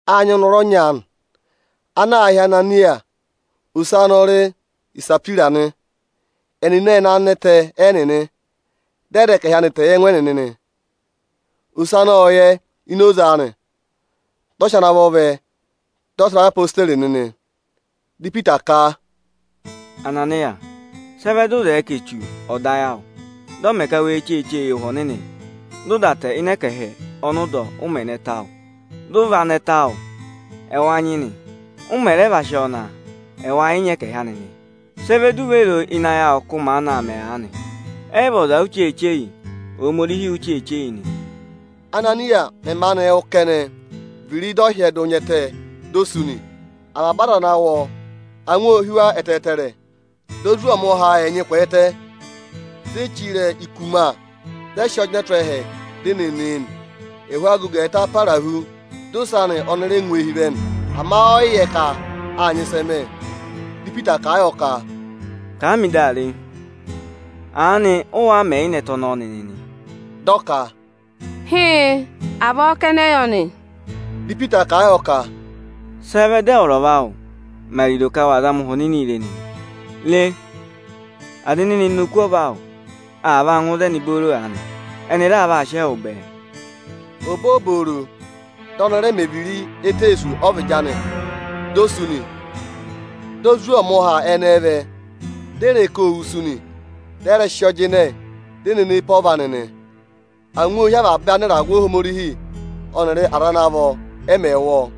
Â nyị ọnọrụ ọnya aanị ana aā hị́ Ananịya. Ose anị ọ rị Isahwira nị. Ẹnịnị ệ ná ịnị ẹtẹ ẹnịnị, dị ọ dà ẹkẹhị anị tẹ yị ẹngụ anị nị. Ose anị ộ yẹ ini oze anị. Dị ọ sị ana vọ vẹ, dị ọ sị va yị odeyi nịnị nị. Dị Ipita ka, “Ananịya! Sị ẹ vẹ dị ụ zẹẹ ka Echu ọ̀ dọ ayị awụ, dị ọ mẹ ka we cheeche yị Ụhwẹ Ọnịnị, dị ụ dà tẹ ịnị ẹkẹhị ọnị ụ dọ, ụ mẹ̀ ná ẹtẹ awụ? Dị ụ va ná ẹtẹ awụ, ẹwa nyị nị. Ụ mẹ̀ rẹ va sị ọọ ná, ẹwa yị nyị ẹkẹhị anị nị. Sị ẹ vẹ di u ve ro o ịnị ayị awụ ka ụ maanị aa mẹ aanị? Ẹ yị vị ọza u cheeche yị, Ohomorihi u cheeche yị nị o.” Ánaniya mẹ̀ maanị wụ́ kẹnẹ, viri dị ọ hyẹdụ nya ẹtẹ di o sú nị. Avaba aza ana wụ́ ọ, angwa ô hí wa ẹtẹẹtẹrẹ. Dị ozwọọmụha ẹnyị kwẹẹtẹ, di e chire e ikuma, dị ẹ sị ọ jịnẹ tụ́ ẹhẹ, di e ne ne e nị. Ẹhụụ agogo ẹẹta para hu, di ose anị ọnị rẹ ngụ eehi vẹ nị. Ama ọyị yẹ ka â nyị ịsị ẹ mẹ̀. Dị Ipita kà a yọ ka, “Kà a mị dị a re, aanị ụ wáá mẹ̀ yị ná ẹtẹ ọnọọ nịnị nị?” Dị ọ ka, “Hịịn, avọọ aa ná a nị.” Dị Ipita kà a yọ ka, “Sị ẹ vẹ dị ẹwụrị ọva awụ mẹ ariro ka wa zama Ụhwẹ Ọnịnị re nịnị? Re! Aza ene ne ne oku ọva awụ, aa vaa ngụ ịzẹnị booro aanị, ẹnị raa vaa sị ẹwụ bẹẹ.” Obooboro, dị ọnị rẹ mẹ viri éteesu ọ́vịdị anị, di o sú nị. Dị ozwọọmụha ẹnẹẹ vẹ, di e re ka ô wusu nị. Dị ẹ rẹ sị ọọ jịnẹ, di e ne ne e pe ọva anị nị. Angwa ô hí avaba anịragụ Ohomorihi ọnịrị aza ana vọ, ẹ mẹ̀ wụ́ ọọ.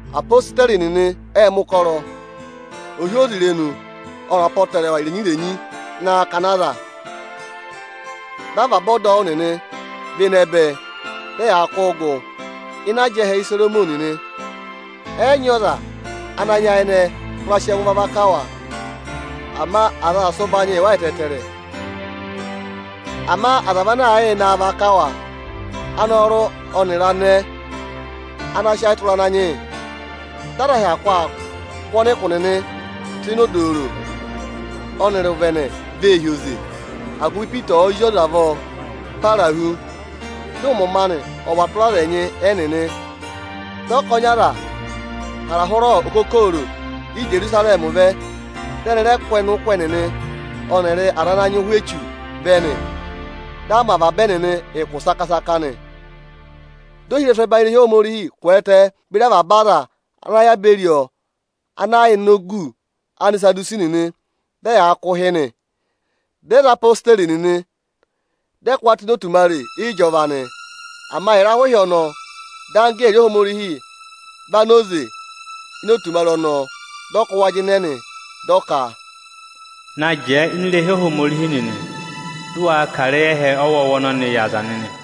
Apositeri nịnị ệ mẹ̀ ụkọrọ ohyozirenu ọnịrị apọtẹrẹwa irenyi-irenyi ịnị akakana aza. Dị avaba ọdọwụ nịnị và ịnẹ bẹ, dị ẹyaa kụ́ụ gụ ịnị ajẹhẹ Isoromọnị nị. Ẹ yị nyị ọza ana nyayịnẹ hụra sị ẹngụ va vaka wa, ama aza aa sị ụbanyịị yị wa ẹtẹẹtẹrẹ. Ama aza vị ana aa yịị naa vaka wa, anọrụ ọnịrị anẹẹ ana sị ayị tụra Ananyị yị. Dị aza hyakụ aa kụ́ ọnịkụ nịnị tụ́ ịnị odooro ọnịrị ịnị ụvẹnẹ vee hi oze, agụvị Ipita ọ̀ọ zị avọọ para hu, dị ụmọmọ anị ọ̀ và tụra aza ẹnyị ẹnịnị. Dị ọkọnị aza hara hụrẹ okokooro Ijerusarẹmị vẹ, dị ẹnị rẹ kụ́ ọnịkụ ẹnịnị ọnịrị aza ana nyị ụhwẹ echu vẹ nị. Dị a mẹ avaba ẹnịnị ụkụ saka-saka nị. Dị ohirẹsụ ọbanyị irehi Ohomorihi kwẹẹtẹ beri avaba aza ana yà beri ọ ana yà ini ogu Anisadusi nịnị, dị ẹyaa kụ̀ ụhị nị. Dị ẹ za odeyi nịnị, dị ẹ kụ́ wa tụ́ ịnị otumare ịjọva nị. Ama ịrahụ ịhị ọnọọ, dị anggẹẹrị Ohomorihi va na oze ini otumare ọnọọ, dị ọ kụ́ wa jịnẹ nị. Dị ọ ka: “Na jẹẹ ini irehi Ohomorihi nịnị, dị ụ waa kà ịrẹyị ẹhẹ ọwọọwa ọnọnịị yị aza nịnị!”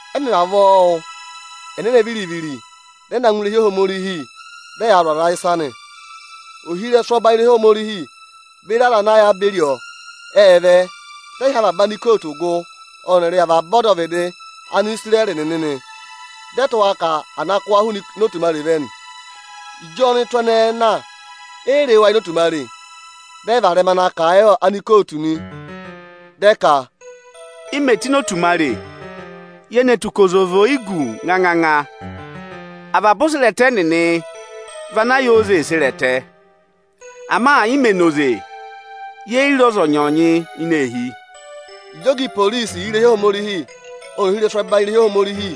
Ẹ mẹ̀ vavọọ wụ́, ẹnẹnẹ viri-viri dị ẹ na ngụ ini irehi Ohomorihi, dị ẹyaa zụ̀ aza ịsa nị. Ohirẹsụ ọbanyị irehi Ohomorihi beri aza ana yà beri ọ, ệ vẹ, dị ẹ hị́ avaba anikootu gụ ọnịrị avaba ọdọvịdị Anisirẹrị nịnị nị. Dị ẹ tụ́ ka à na kụ́ wa hụụnị otumare vẹ nị. Ịjị ọnụtụ ẹnẹẹ na, e yi re wa ini otumare. Dị ẹ varẹma na kà a yị anikootu nị. Dị ẹ ka: “I mè tù ini otumare, ye ne tù ka oze vị oyichire nganganga, avaba oserẹtẹ nịnị vị ana yà oze ee sere ẹtẹ. Ama ị mẹ̀ na oze, ye yi re ọzọnyị-ọzọnyị ini eehi!” Ịjị ọga iporisi irehi Ohomorihi ọnịrị ohirẹsụ ẹbanyị irehi Ohomorihi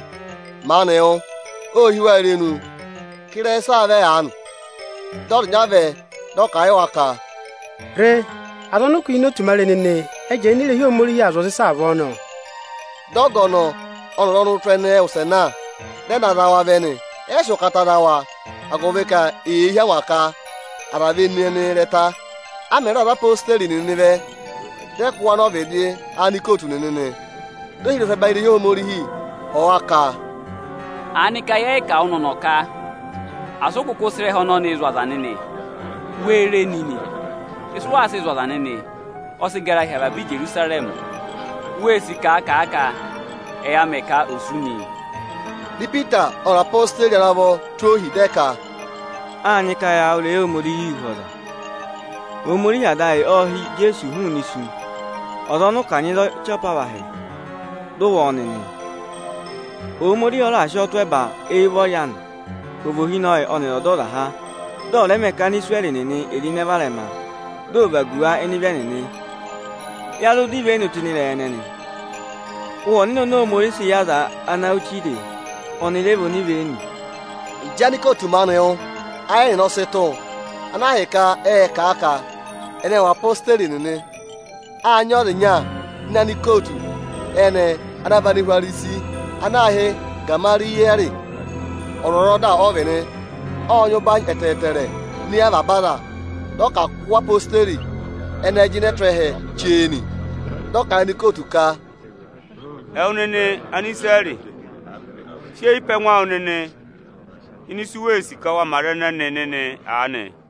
maanị wụ́, ô hí wa irenu ka ịrẹyị ịsị aa vẹ aanị? Dị ọza ịnya vẹ, dị ọ kà a yị wa ka, “Re! Aza ọnị ụ kụ́ hi ini otumare nịnị, ẹ jẹẹ ini irehi Ohomorihi aa zụ̀ aza ịsa avọọ nọ!” Dị ọga ọnọọ ọnịrị ọnụtụ ẹnẹẹ wụsẹ na, dị ẹ na za wa vẹ nị. Ẹ yị sị ụkata za wa, agụvị ka eyee hí angwa ka aza ve ne ẹnị ịrẹta. A mẹ̀ raà za odeyi nịnị vẹ, dị a kụ́ wa nọ ọvịdị anikootu nịnị nị. Dị ohirẹsụ ọbanyị irehi Ohomorihi họ̀ wa ka: “Aanịka yẹ́ẹ́ kà wụ nịnị ọ̀nọ̀ ka asị ụ kụkụ sị ịrẹha ọnọnị zụ̀ aza ịsa nịnị? Wee re nịnị! Ịsị ụ waa sịị zụ̀ aza nịnị, ọ sị gara hi avaba Ijerusarẹmị. Wee sì ka à kà a ka ẹ ya mẹ ka a wụ̀ nị.” Dị Ipita ọnịrị odeyi ana vọ tụ́ ohi, dị ẹ ka, “Â nyị ka ya wụ́ ịrẹyị Ohomorihi hu ọ́ọza. Ohomorihi Ada ayị ộ ha Ijeesu hụụnị isu, ọza ọnị ụ kanyị za ọchị apavahị, dị ụ wụ ọ nịnị. Ohomorihi ọ raà sị ọọ tụ́ ẹba éyi ụvọrị anị, ka ọ̀ vị Ohinọyị ọnịrị Ọdọzaha. Dị ọ̀ rẹ mẹ ka Anisirẹrị nịnị è ro ịnẹ varẹma, dị ọ̀ vagu wa ịnị ịvị ẹnịnị. Ya zụ dọ ivenu tụ́ ịnị ịrẹyị ẹnẹnị. Ụhwẹ Ọnịnị oni Ohomorihi sị yị aza ana wụ́ chire e, ọnị rẹ vị onivenu.” Ịjị anikootu maanị wụ́, ayị ẹnịnị ọ sị tụ̀, ana ahịka ẹnịnị ê sì ka ẹnị ẹ̀ wụ odeyi nịnị. Â nyị ọza ịnya ini anikootu ẹnẹẹ, ana vị Anihwarisi ana aā hị́ Igamariyẹẹrị. Ọzwọzọda ọ vị nị. Ộ nyị ụbanyị ẹtẹẹtẹrẹ ini eyi avaba aza. Dị ọ ka à kụ́ odeyi ẹnẹẹ jịnẹ tụ́ ẹhẹ chee nị. Dị ọ kà a yị anikootu ka, “Ẹwụ nịnị Anisirẹrị, sị eyi pe ẹngụ awụ nịnị ini ịsị u wee sì ka wa mẹ aza ẹnẹnị nịnị aanị o!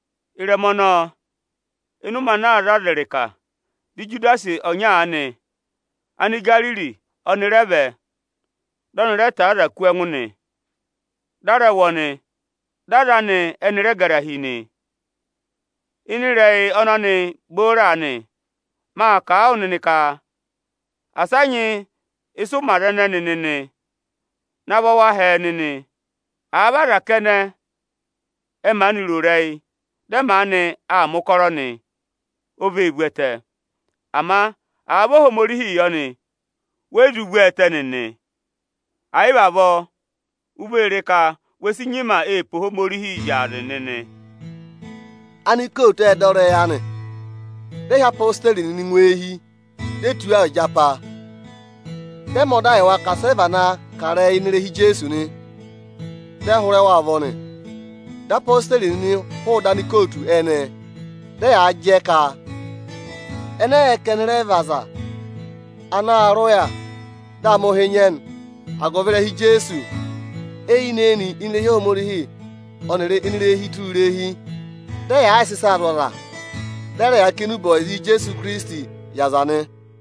Ịrẹma ọnọọ, ịnị ụmẹ ana aa za aza ịrịka, dị Ijudasi ọnya aanị, Anigariri ọnị rẹ vẹ, dị ọnị rẹ tọ̀ọ́ aza kú ẹngụ nị. Dị a rẹ wụ ọnị, dị aza anị ẹnị rẹ gara hi nị. Ịnị ịrẹyị ọnọnị booro aanị, ma kà a wụ nịnị ka asị a nyị ịsị ụ mẹ aza ẹnẹnị nịnị, navọ wa hẹẹ nịnị! Àa vị aza kẹnẹ, ẹ maanị ro ịrẹyị, dị ẹ maanị aa mẹ̀ ụkọrọ nị, o vee vu ẹtẹ. Ama àa vị Ohomorihii yọ nị, we yi zụ vú ọ ẹtẹ nịnị. Ẹ̀ yị vị avọọ, u vee re ka we si nyima ee pe Ohomorihi zyaazị nịnị.” Anikootu ệ dọ ịrẹyị anị, dị ẹ hị́ odeyi nịnị ngụ eehi, di e tụ́ wa ịjapa, dị ẹ mẹ ọda yị wa ka asị ẹ vana kà ịrẹyị ịnị ịrẹha Ijeesu nị. Dị ẹ hụrẹ wa ụvọ nị. Dị odeyi nịnị hụụ ịdị anikootu ẹnẹẹ, dị ẹyaa jẹ ka ẹnị ẹ yị yẹ ka ẹnị rẹ vị ọza ana aa rị ụya, dị a mẹ̀ ụhị nyị ẹnị agụvị ịrẹha Ijeesu. Eyinị-eyinị, ini irehi Ohomorihi ọnịrị hụụnị ini irehi ọnya na ngụ ọsa, dị ẹyaa yịị sị ịsaa zụ̀ aza, dị ẹ rẹ yaa kà enube ọyịza Ijeesu Ikirisitii yị aza nị.